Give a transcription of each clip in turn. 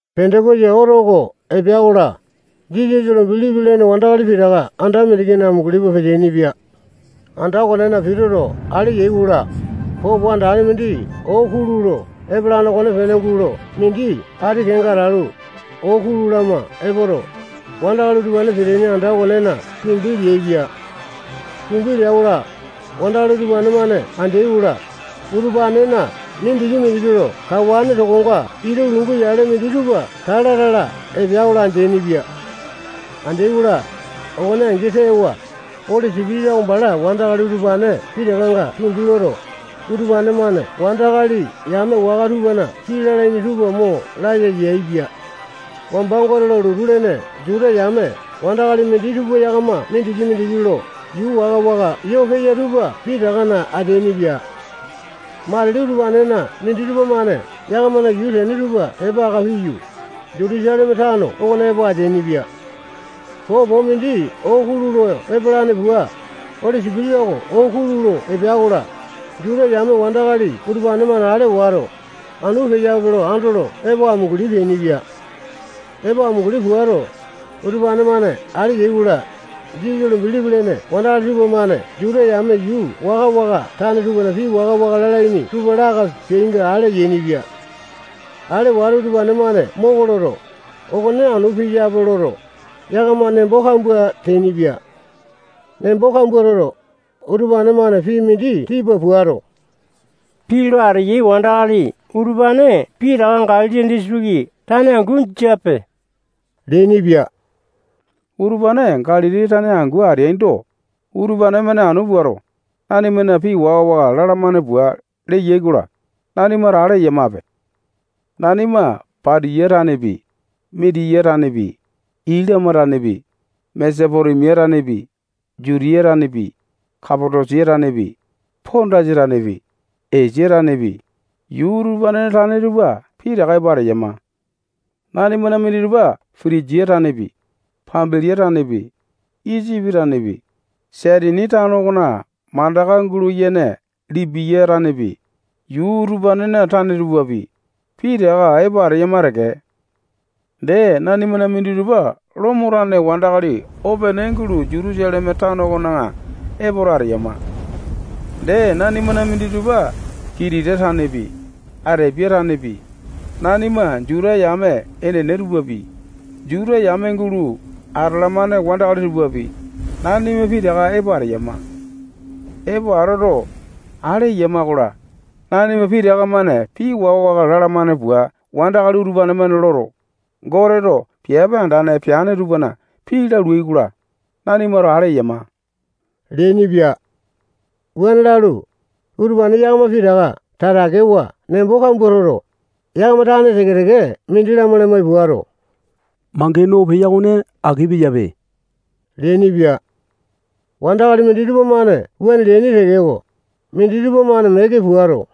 Pendokosa oto oko epea-kola, Jisasa lo bilipi lene wandakali pitaka anda mindikina amunguli pua peteaini-pia. Anda okonena pituto ale yai-kola, popo andane mindi oo kulu lo epalane okonepene gulo mindi ati kenga atalu, oo kulu lama epoto, wandakali utupane peteaini anda okonena tumbi leaipia. Tumbi lea-kola, wandakali utupane-mane andeai-kola, utupanena mindiki-mindiki lo kawane tokonga ita lungu yale minditupa tala-tala epea-kola, andeaini-pia. Andeai-kola, okone angi tewa, Oli Sipitisa oko bala wandakali utupane pitakanga tumbi loto, utupane-mane wandakali yame waka tupana pii lalaini tupa mo laya yaepia. Wamba Gote lo lotu lene Juta yame wandakali minditupa yakama mindiki-mindiki lo yuu waka-waka yo peya tupa pitakana ateainipia. Matili utupanena minditupa-mane yakamana yuu tene tupa tepa aka piyu, Jutusaleme tano okona epo ateainipia. Popo mindi oo kulu lo epalane pua, Oli Sipitisa oko oo kulu lo epea-kola, Juta yame wandakali utupane-mane ale wato, anu peyape lo andolo epo amunguli peainipia. Epo amunguli puato, utupane-mane ale yai-kola, Jisasa lo bilipi lene wandakali tupamane Juta yame yuu waka-waka tane tupana pii waka-waka lalaini tupa laka peainga ale yainipia. Ale wato, utupane-mane moko loto, okone anu peyape loto, yakama nembo kambua teainipia. Nembo kambua toto, utupane-mane pii mindi tipa puato, pii lo ateyai wandakali utupane pitaka Galili disitiki tane angu jiape leainipia. Utupane Galili tane angu ateaindo, utupane-mane anu puato, nanimana pii waka-waka lalamane pua leyai-kola, nanimato ale eyamape. Nanima Patiya tanepi, Mitiya tanepi, Ilama tanepi, Mesopotemia tanepi, Jutiya tanepi, Kapatosia tanepi, Pondasa tanepi, Esia tanepi, yuu utupanena tane tupa pitaka epo ateyama. Nanimana minditupa Pitinjia tanepi, Pambilia tanepi, Isipi tanepi, Saitini tano okona mandaka gulo yene Lipiya tanepi, yuu utupanena tane tupapi, pitaka epo ateyama teke. Dee, nanimana minditupa Lomo tane wandakali opene gulo Jutusaleme tano okona epoto ateyama. Dee, nanimana minditupa Kitita tanepi, Atepiya tanepi, nanima Juta yame enene tupapi, Juta yame gulo atalamane wandakali tupapi, nanima pitaka epo ateyama. Epo atoto, ale eyama-kola, nanima pitaka-mane pii waka-waka lalamane pua wandakali utupane-mane loto, Goteto piape andane peane tupana pii laluai-kola, nanimato ale eyama leainipia. Wuane lalu, utupane yakama pitaka tatakewa nembo kambua toto, yakama tane teke-teke mindi lamai-lamai puato, mangene oo peya okone aki peyape leainipia. Wandakali minditupa-mane wuane leaini tekeko, minditupa-mane meke puato,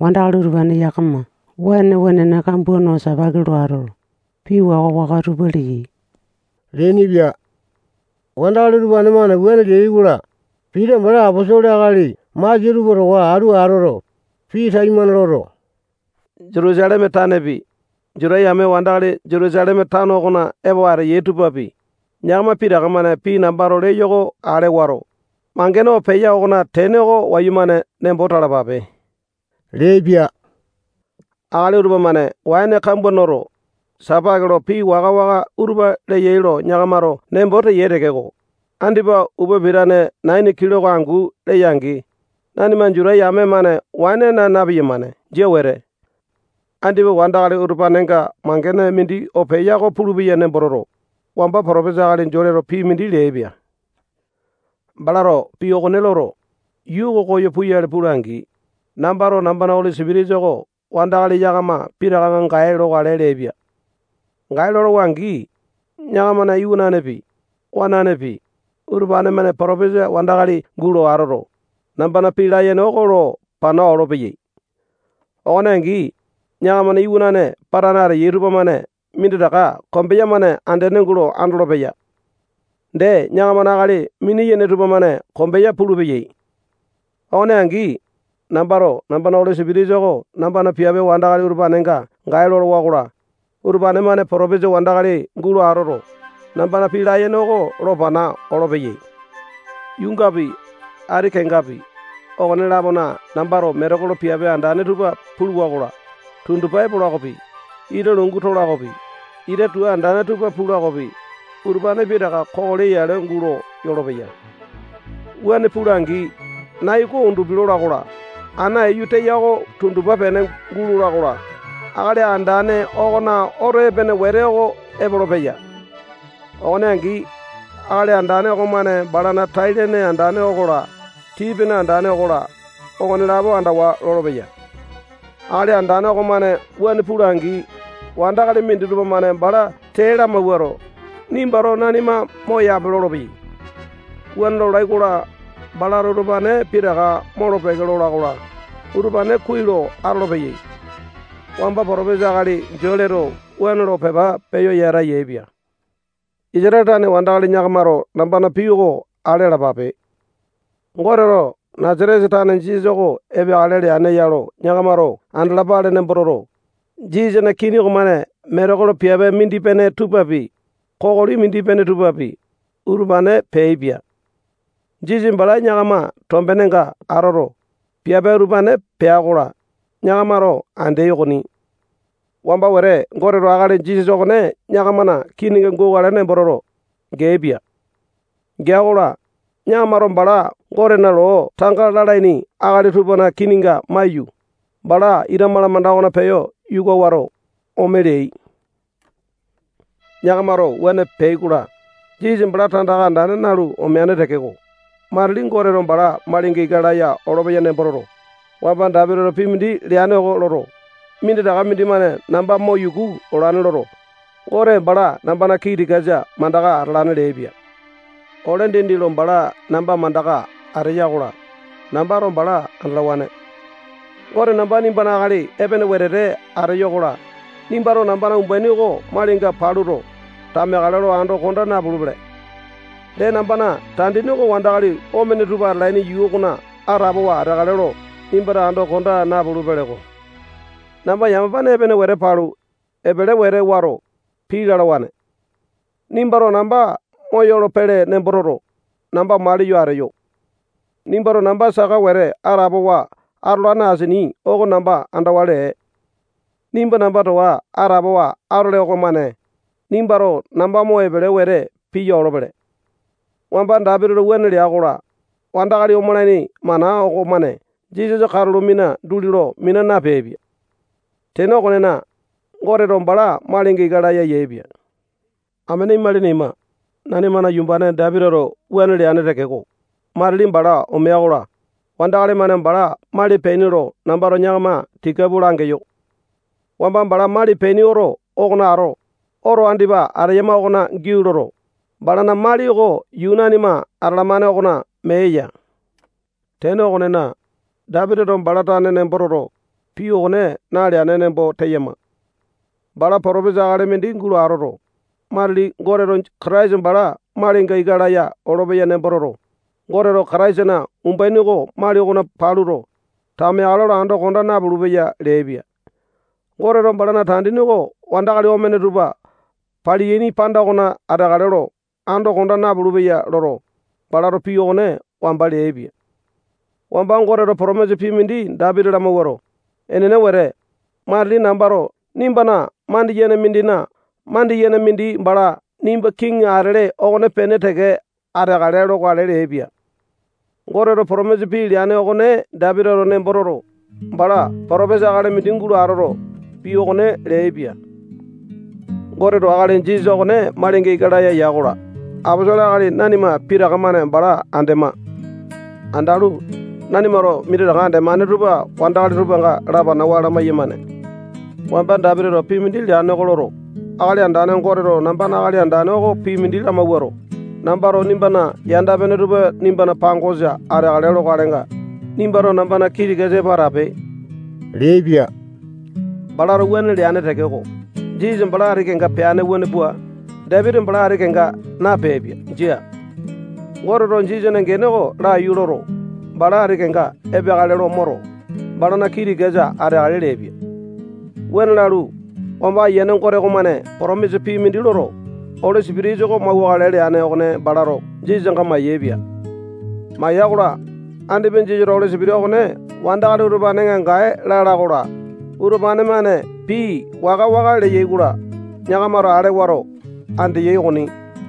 wandakali utupane yakama waene wenene kambua no sipaki lo atoto, pii waka-waka utupa leyai leainipia. Wandakali utupane-mane wuane leai-kola, Pita bala aposolo akali masia tupa towa atu atoto, pii taimane loto, Jutusaleme tanepi, Juta yame wandakali Jutusaleme tano okona epo ateyai tupapi, yakama pitaka-mane pii nambato leyo oko ale wato, mangene oo peya okona tene oko wayumane nembo talapape leaipia. Akali utupa-mane waene kambua noto, sapake lo pii waka-waka utupa leyai lo yakamato nembo teyai tekeko, andipa upa pitane naini kiloko angu leya-angi, nanima Juta yame-mane waene naa na-piyamane. Jia wete. Andipa wandakali utupanenga mangene mindi oo peya oko pulupeya nembo toto, wamba potopesa akali Joeleto pii mindi leaipia. Balato pii okone loto, yuu oko koyo puyale pula-angi, nambato nambana Oli Sipitisa oko wandakali yakama pitakanga gae lokale leaipia. Gae lolowa-angi, yakamana iwananepi, wananepi, utupane-mane potopesa wandakali gulo atoto, nambana pii layene oko lo pana olopeyai. Okone angi, yakamana iwana patane ateyai tupamane minditaka kombeya-mane andene gulo andolopeya. Dee, yakamana akali mini-yene tupamane kombeya pulupeyai. Okone angi, nambato nambana Oli Sipitisa oko nambana piape wandakali utupanenga gae lolowa-kola, utupane-mane potopesa wandakali gulo atoto, nambana pii layene oko lo pana olopeyai. Yuungapi, ati kengapi, okone-lapona nambato metekolo piape andane tupa puluwa-kola, tundupa epola okopi, ita lungu tola okopi, ita tua andane tupa pula okopi, utupane pitaka kokoli yale gulo yolopeya. Wuane pula-angi, nai oko undupi lola-kola, ana iyu teya oko tundupa pene gulola-kola, Akali Andane okona oto epene wete oko epolopeya. Okone angi, Akali Andane okomane balana tai-lene andane okola, tii-pene andane okola, okonelapo andawa lolopeya. Akali Andane okomane wuane pula-angi, wandakali minditupa-mane bala tee lamawuato, nimbato nanima moyape lolopeyai. Wuane lolai-kola, balato utupane pitaka molo-peke lola-kola, utupane kuai lo atolopeyai. Wamba potopesa akali Joeleto wuane lo pepa peyo yata yaepia. Isatale tane wandakali yakamato nambana pii oko ale alapape. Goteto Nasatesa tane Jisasa oko epeakale leane ya lo yakamato andalapale nembo toto, Jisasana kini okomane metekolo piape mindi-pene tupapi, kokoli mindi-pene tupapi, utupane peaipia. Jisasa bala yakama tombenenga atoto, piape utupane pea-kola, yakamato andeai okoni. Wamba wete Goteto akali Jisasa okone yakamana kininga gukale nembo toto, geaipia. Gea-kola, yakamato bala Gotena loo tanga lalaini akali tupana kininga maiyu, bala ita malamanda okona peyo yuka wato, ome leai. Yakamato wuane peai-kola, Jisasa bala tandaka andane nalu omeane tekeko, matili Goteto bala malinga ika laya olopeya nembo toto, wamba Dapitito pii mindi leane oko loto, minditaka mindimane namba mo yuku olane loto, Gote bala nambana kii tikasa mandaka atalane leaipia. Ole dindi lo bala namba mandaka ateya-kola, nambato bala andalawane. Gote namba nimbana akali epene wetete ateyo-kola, nimbato nambana umbaini oko malinga paluto, tameakale lo ando konda napulupele. Dee, nambana tandini oko wandakali omene tupa atalaini yuu okona atapowa ateakale lo nimbato ando konda napulu-peleko. Namba yamapane epene wete palu, epele wete wato, pii lalawane. Nimbato namba moyolo-pele nembo toto, namba maliyo ateyo. Nimbato namba saka wete atapowa atolane asini oko namba andawa lee. Nimba namba towa atapowa atole okomane, nimbato namba mo epele wete piya olopele. Wamba Dapitito wuane lea-kola, wandakali omalaini mana okomane Jisasa katulo mina duli lo mina napeaipia. Tene okonena, Goteto bala malinga ika laya yaepia. Amene imalini ima, nanimana yumbane Dapitito wuane leane tekeko, matili bala omea-kola, wandakali-mane bala mali peaini lo nambato yakama tika pua langeyo. Wamba bala mali peaini oto okona ato, oto andipa ateyama okona giau loto, balana mali oko yuu nanima atalamane okona mee eya. Tene okonena, Dapitito bala tane nembo toto, pii okone naleane nembo teyama. Bala potopesa akali mindi gulo atoto, matili Goteto Kataisa bala malinga ika laya olopeya nembo toto, Goteto Kataisana umbaini oko mali okona paluto, tameakale lo ando konda napulu-peya leaipia. Goteto balana tandini oko wandakali omene tupa paliyaini panda okona ateakale lo ando konda napulu-peya loto, balato pii okone wamba leaipia. Wamba Goteto potomisa pii mindi Dapiti lamawuato, enene wete, matili nambato nimbana mandiyene mindina mandiyene mindi bala nimba kiŋi atele okonepene teke ateakale lokale leaipia. Goteto potomisa pii leane okone Dapitito nembo toto, bala potopesa akali mindi gulo atoto, pii okone leaipia. Goteto akali Jisasa okone malinga ika laya ya-kola, aposolo akali nanima pitaka-mane bala andema. Andalu, nanimato minditaka andemane tupa wandakali tupanga lapanawa lamai-yamane. Wamba Dapitito pii mindi leane oko loto, Akali Andane Goteto nambana Akali Andane oko pii mindi lamawuato, nambato nimbana yanda-pene tupa nimbana pangosa ateakale lokalenga, nimbato nambana kii tikasa epo atape leaipia. Balato wuane leane tekeko, Jisasa bala ati kenga peane wuane pua, Dapiti bala ati kenga napeaipia. Jia. Goteto Jisasana gene oko laiyu loto, bala ati kenga epeakale lo moto, balana kii tikasa ateakale leaipia. Wuane lalu, wamba Ayiane Gote okomane potomisa pii mindi loto, Oli Sipitisa oko mauwakale leane okone balato Jisasanga mayaepia. Maya-kola, andipa Jisasato Oli Sipitisa okone wandakali utupanenga gae lala-kola, utupane-mane pii waka-waka leyai-kola, yakamato ale wato, andeyai okoni.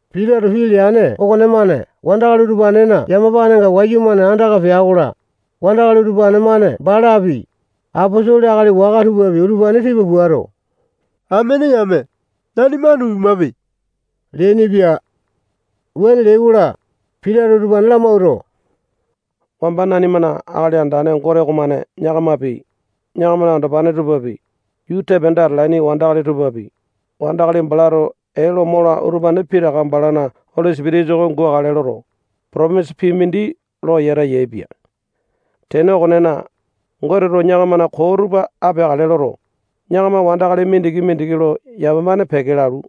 Pitato pii leane okonemane wandakali utupanena yamapanenga wayumane andaka pea-kola, wandakali utupane-mane balapi, aposolo akali waka tupapi, utupane tipa puato, amene yame, nanima anu pimape leainipia. Wuane leai-kola, Pitato utupane lamawuato, wamba nanimana Akali Andane Gote okomane yakamapi, yakamana andopane tupapi, yuu tepanda atalaini wandakali tupapi, wandakali balato ee lo mola utupane pitaka balana Oli Sipitisa oko gukale loto, potomisa pii mindi lo yata yaepia. Tene okonena, Goteto yakamana koo tupa apeakale loto, yakama wandakali mindiki-mindiki lo yamapane peke lalu,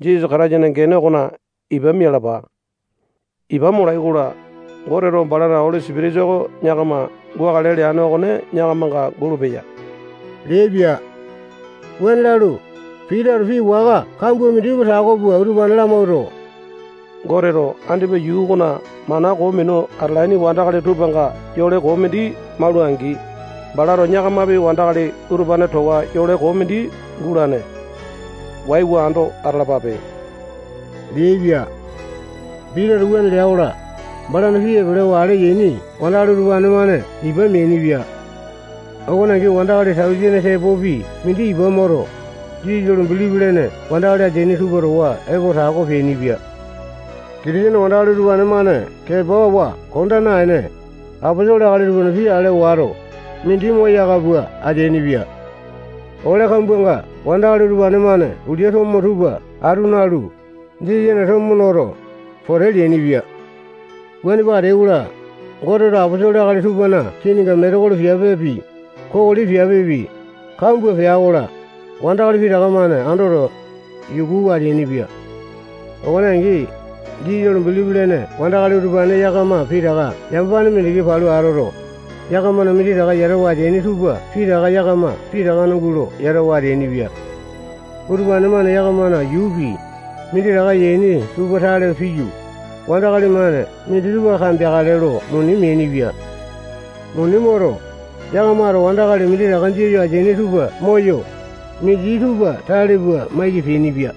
Jisasa Kataisana gene okona ipa mialapa. Ipa molai-kola, Goteto balana Oli Sipitisa oko yakama gukale leane okone yakamanga gulupeya leaipia. Wuane lalu, Pitato pii waka kambua minditupa tako pua utupane lamawuato, Goteto andipa yuu okona mana koo minu atalaini wandakali tupanga yole koo mindi maula-angi, balato yakamapi wandakali utupane towa yole koo mindi gulane. Waiwa ando atalapape leaipia. Pitato wuane lea-kola, balana pii epelewa ale yaini wandakali tupamane ipa meainipia. Okone angi wandakali tausene tepopi mindi ipa moto, Jisasa lo bilipi lene wandakali ateaini tupa towa epo tako peainipia. Kitisene wandakali utupane-mane kepawa konda naene, aposolo akali tupana pii ale wato, mindi moyaka pua ateainipia. Ole kambuanga wandakali utupane-mane ulia tomo tupa atu nalu, Jisasana tomo noto, pote leainipia. Wuane pua ateai-kola, Goteto aposolo akali tupana kininga metekolo piapepi, kokoli piapepi, kambua pea-kola, wandakali pitaka-mane andoto, yukuwa ateainipia. Okone angi, Jisasa lo bilipi lene wandakali utupane yakama pitaka yamapane mindiki palu atoto, yakamana minditaka yatawa ateaini tupa pitaka yakama pitakana gulo yatawa ateainipia. Utupane-mane yakamana yuupi, minditaka yaini tupa tale piyu, wandakali-mane minditupa kambeakale lo muni meainipia. Muni moto, yakamato wandakali minditaka jia yo ateaini tupa moyo, minditupa tale pua maiki peainipia.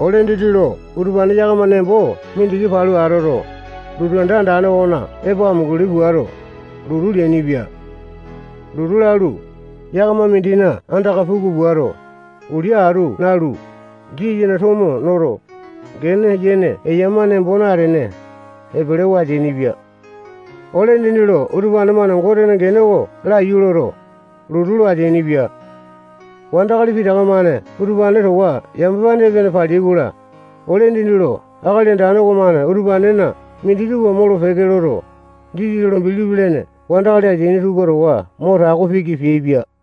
Ole dindi lo utupane yakama nembo mindiki palu atoto, lotu anda andane okona epo amunguli puato, lotu leainipia. Lotu lalu, yakama mindina andaka puku puato, ulia atu nalu, Jisasana tomo noto, gene yene eyama nembo natene, epelewa ateainipia. Ole dindi lo utupane-mane Gotena gene oko laiyu loto, lotu lo ateainipia. Wandakali pitaka-mane utupane towa yamapane epene paleai-kola, ole dindi lo Akali Andane okomane utupanena minditupa molo-peke loto, Jisasa lo bilipi lene wandakali ateaini tupa towa mo tako piki peaipia.